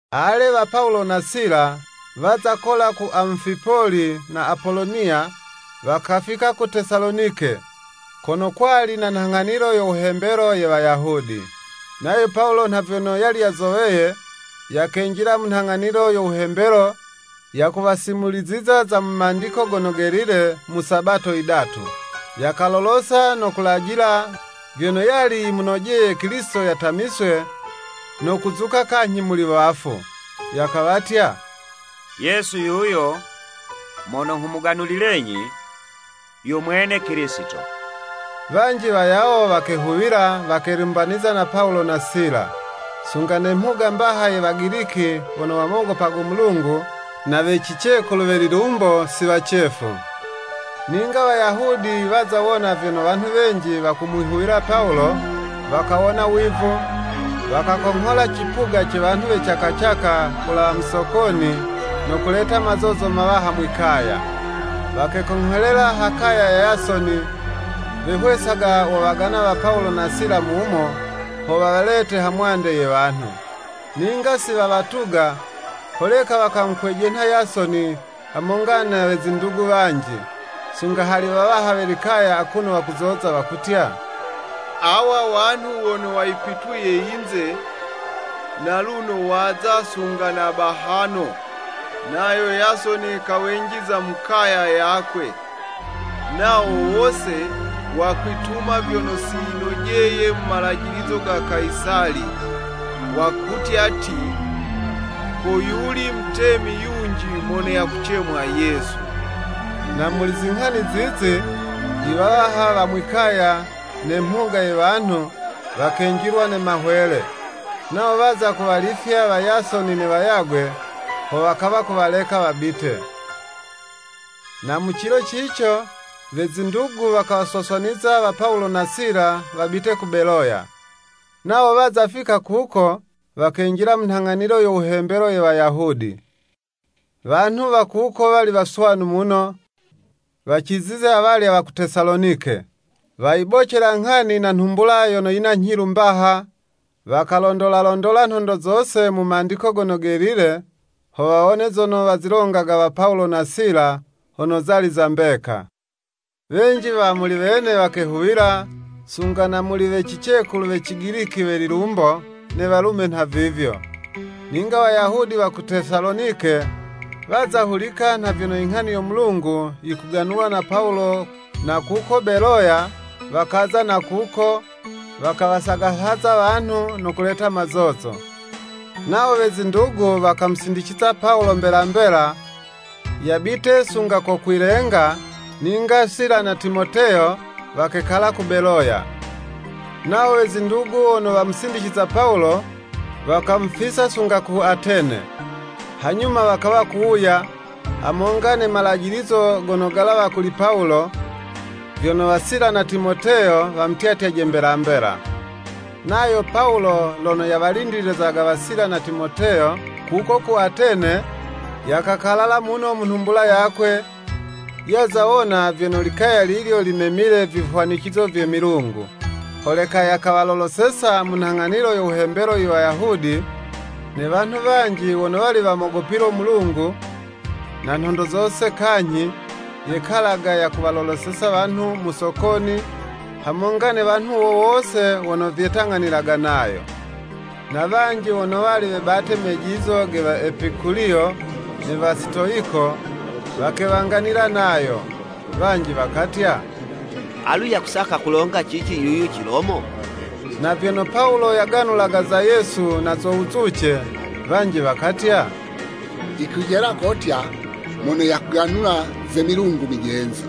Ale, wa Pawulo na Sila, waza kola ku Amufipoli na Apoloniya, wakafika ku Tesalonike, kono kwali na nhang'anilo yo wuhembelo ye Wayahudi. Nayo Pawulo nha vyono yali yazoweye, yakenjila mu nghang'anilo yo wuhembelo yakuwasimuliziza za mu Mandiko Gono Gelile mu Sabato yidatu. Yakalolosa no kulajila vyono yali yimunojeye Kilisito yatamiswe, no kuzuka kanyhi muli wafu. Yakawatya “Yesu yuyo mono nghumuganulilenyi, yo mwene Kilisito.” Wanji wayawo wakehuwila wakelumbaniza na Pawulo na Sila. Sunga ne mhuga mbaha ye Wagiliki wono wamogopago Mulungu, na we cicekulu we lilumbo, si wacefu. Ninga Wayahudi waza wona vyono wanhu wenji wakumwihuwila Pawulo, wakawona wivu, wakakonghola cipuga ce wanhu we cakacaka kulawa mu sokoni, no kuleta mazozo mawaha mwi'kaya. Wakekongholela ha kaya ya Yasoni, wehwesaga wowagana wa Pawulo na Sila mumo, ho wawalete hamwande ye wanhu. Ninga si wawatuga, holeka wakamukwejenha Yasoni, hamonga na we zindugu wanji, sunga hali wawaha we likaya, akuno wakuzoza wakutya, “Awa wanhu wono wayipituye yinze, naluno waza sunga na bahano.” Nayo Yasoni kawenjiza mu kaya yakwe. Nawo wose, wakwituma vyono si vinojeye mu malajilizo ga Kayisali, wakutya ti, “Ko yuli mutemi yunji mono yakucemwa Yesu.” Na muli zinghani zizi, iwawaha wa mwi'kaya, ne mhuga ye wanhu, wakenjilwa ne mahwele. Nawo waza kuwalifya wa Yasoni ne wayagwe, ho wakawa kuwaleka wabite. Na mu cilo cico, we zindugu wakawaswaswaniza wa Pawulo na Sila wabite ku Beloya. Nawo waza fika kuko, wakenjila mu nhang'anilo yo wuhembelo ye Wayahudi. Wanhu wa kuko wali waswanu muno, wacizize awalya wa ku Tesalonike. Wayibocela nghani na nhumbula yono yina nyhilu mbaha, wakalondolalondola nhondo zose mu Mandiko Gono Gelile, ho wawone zono wazilongaga wa Pawulo na Sila hono zali za mbeka. Wenji wa muli wene wakehuwila, sunga na muli we cicekulu we Cigiliki we lilumbo, ne walume nhavivyo. Ninga Wayahudi wa ku Tesalonike, waza hulika nha vyono inghani yo Mulungu yikuganulwa na Pawulo na kuko Beloya, wakaza na kuko, wakawasagahaza wanhu no kuleta mazozo. Nawo we zindugu wakamusindiciza Pawulo mbela mbela, yabite sunga ko kwilenga, ninga Sila na Timoteyo, wakekala ku Beloya. Nawo we zindugu wono wamusindicizaga Pawulo, wakamufisa sunga ku Atene. Hanyuma wakawa kuwuya, hamonga ne malajilizo gono galawa kuli Pawulo, vyono wa Sila na Timoteyo wamutyatyaje mbela mbela. Nayo Pawulo lono yawalindilizaga wa Sila na Timoteyo kuko ku Atene, yakakalala muno mu nhumbula yakwe, yaza wona vyono likaya lilyo limemile vihwanicizo vye milungu. Holeka yakawaloloseza mu nhang'anilo yo wuhembelo Iwayahudi, ne wanhu wanji wono wali wamogopilo Mulungu, na nhondo zose kanyhi, yekalaga yakuwaloloseza wanhu mu sokoni, hamonga ne wanhu wo wose wono vyetang'anilaga nayo. Na wanji wono wali webate mejizo ge Waepikuliyo ne Wasitoyiko, wakewanganila nayo. Wanji wakatya “Alu yakusaka kulonga cici yuyu Cilomo?” Na vyono Pawulo yaganulaga za Yesu na zo wuzuce, wanji wakatya, “Yikwijela kotya mono yakuganula ze milungu mijenzi.”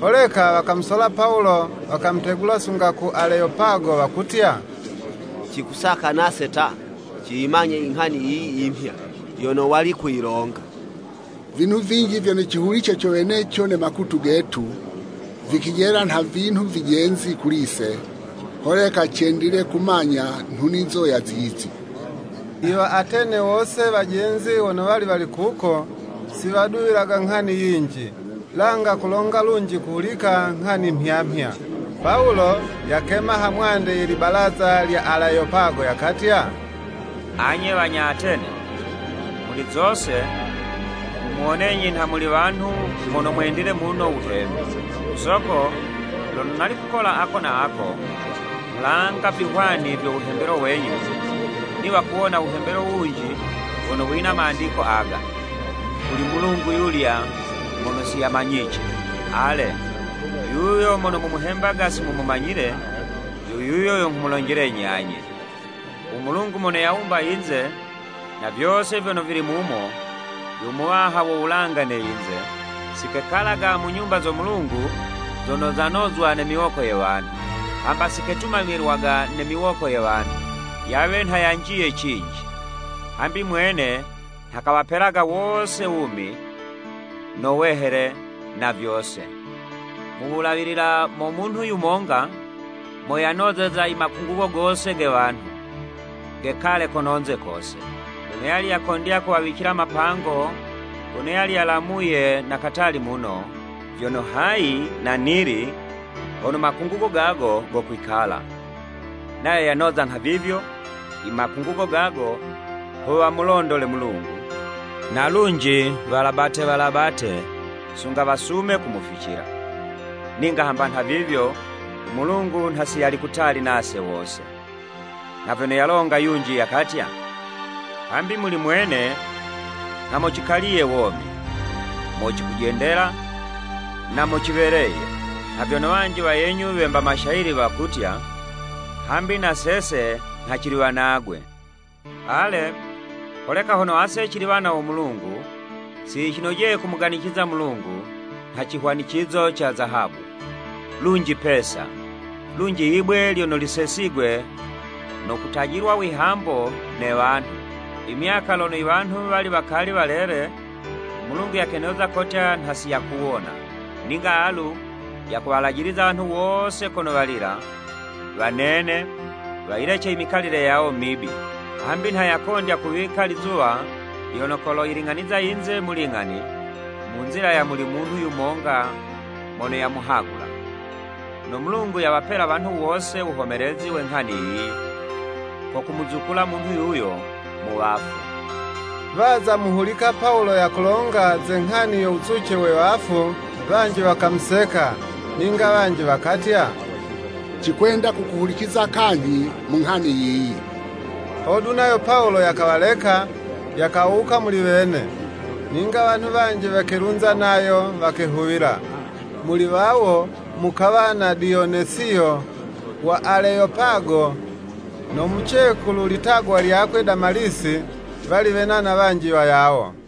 Holeka wakamusola Pawulo, wakamutegula sunga ku Aleyopago, wakutya, “Cikusaka nase ta, ciyimanye inghani yiyi yimhya, yono wali kuyilonga. Vinhu vinji vyono cihulice co weneco ne makutu getu, vikijela nha vinhu vijenzi kuli'se. Holeka cendile kumanya inhunizo ya zizi.” Iwa Atene wose wajenzi wono wali wali kuko, si waduwilaga nghani yinji, langa kulonga lunji kuhulika nghani mhya mhya. Pawulo yakema ha mwande ye libalaza lya Aleyopago, yakatya “Anye wanya Atene! Muli zose, nghumuwonenyi nha muli wanhu mono mwendile muno wuhembi. Ku soko, lono nali kukola ako na ako, nghulanga vihwani vyo wuhembelo wenyu, niwa kuwona wuhembelo wunji wono wina mandiko aga, ‘Kuli mulungu yulya mono si yamanyice.’ Ale, yuyo mono mumuhembaga si mumumanyile, yo yuyo yo nghumulonjelenyi anye. U Mulungu mono yawumba yinze, na vyose vyono vili mumo, yo Muwaha wo wulanga ne yinze, si kekalaga mu nyumba zo Mulungu zono zinozwaga ne miwoko ye wanhu. Hamba si ketumamilwaga ne miwoko ye wanhu, yawe nha yanjiye cinji, hambi mwene nha kawapelaga wose wumi, no wehele, na vyose. Mu wulawilila mo munhu yumonga, mo yanozeza imakungugo gose ge wanhu, gekale kono'nze kose. Lono yali yakondya kuwawicila mapango gono yali yalamuye na katali muno, vyono hayi na nili, hono makungugo gago gokwikala. Nayo yanoza nhavivyo, imakungugo gago ho wamulondole Mulungu, na lunji walabate walabate sunga wasume kumuficila. Ninga hamba nhavivyo, u Mulungu nha si yali kutali nase wose. Nha vyono yalonga yunji yakatya, ‘Hambi muli mwene nha mo cikaliye womi, mo cikujendela, na mo ciweleye.’ Nha vyono wanji wayenyu wemba Mashayili wakutya, ‘Hambi na sese nha cili wanagwe.’ “Ale, holeka hono ase cili wana wo Mulungu, si yicinojeye kumuganiciza u Mulungu nha cihwanicizo ca Zahabu, lunji Pesa, lunji yibwe lyono lisesigwe no kutajilwa wihambo ne wanhu. Imyaka lono iwanhu wali wakali walele u Mulungu yakenoza kotya nha siyakuwona. Ninga alu yakuwalajiliza wanhu wose kono walila, wanene, wayilece imikalile yawo mibi. Hambi nha yakondya kuwika lizuwa lyono koloyiling'aniza yinze mu ling'ani, mu nzila ya muli munhu yumonga mono yamuhagula. No Mulungu yawapela wanhu wose wuhomelezi we nghani yiyi, ko kumuzukula munhu yuyo mu wafu!” Waza muhulika Pawulo yakulonga ze nghani yo wuzuce we wafu, wanji wakamuseka, ninga wanji wakatya, “Cikwenda kukuhuliciza kanyhi mu nghani yiyi.” Hodu nayo Pawulo yakawaleka, yakawuka muli wene. Ninga wanhu wanji wakelunza nayo, wakehuwila. Muli wawo, mukawa na Diyonesiyo wa Aleyopago no mucekulu litagwa lyakwe Damalisi, wali wena na wanji wayawo.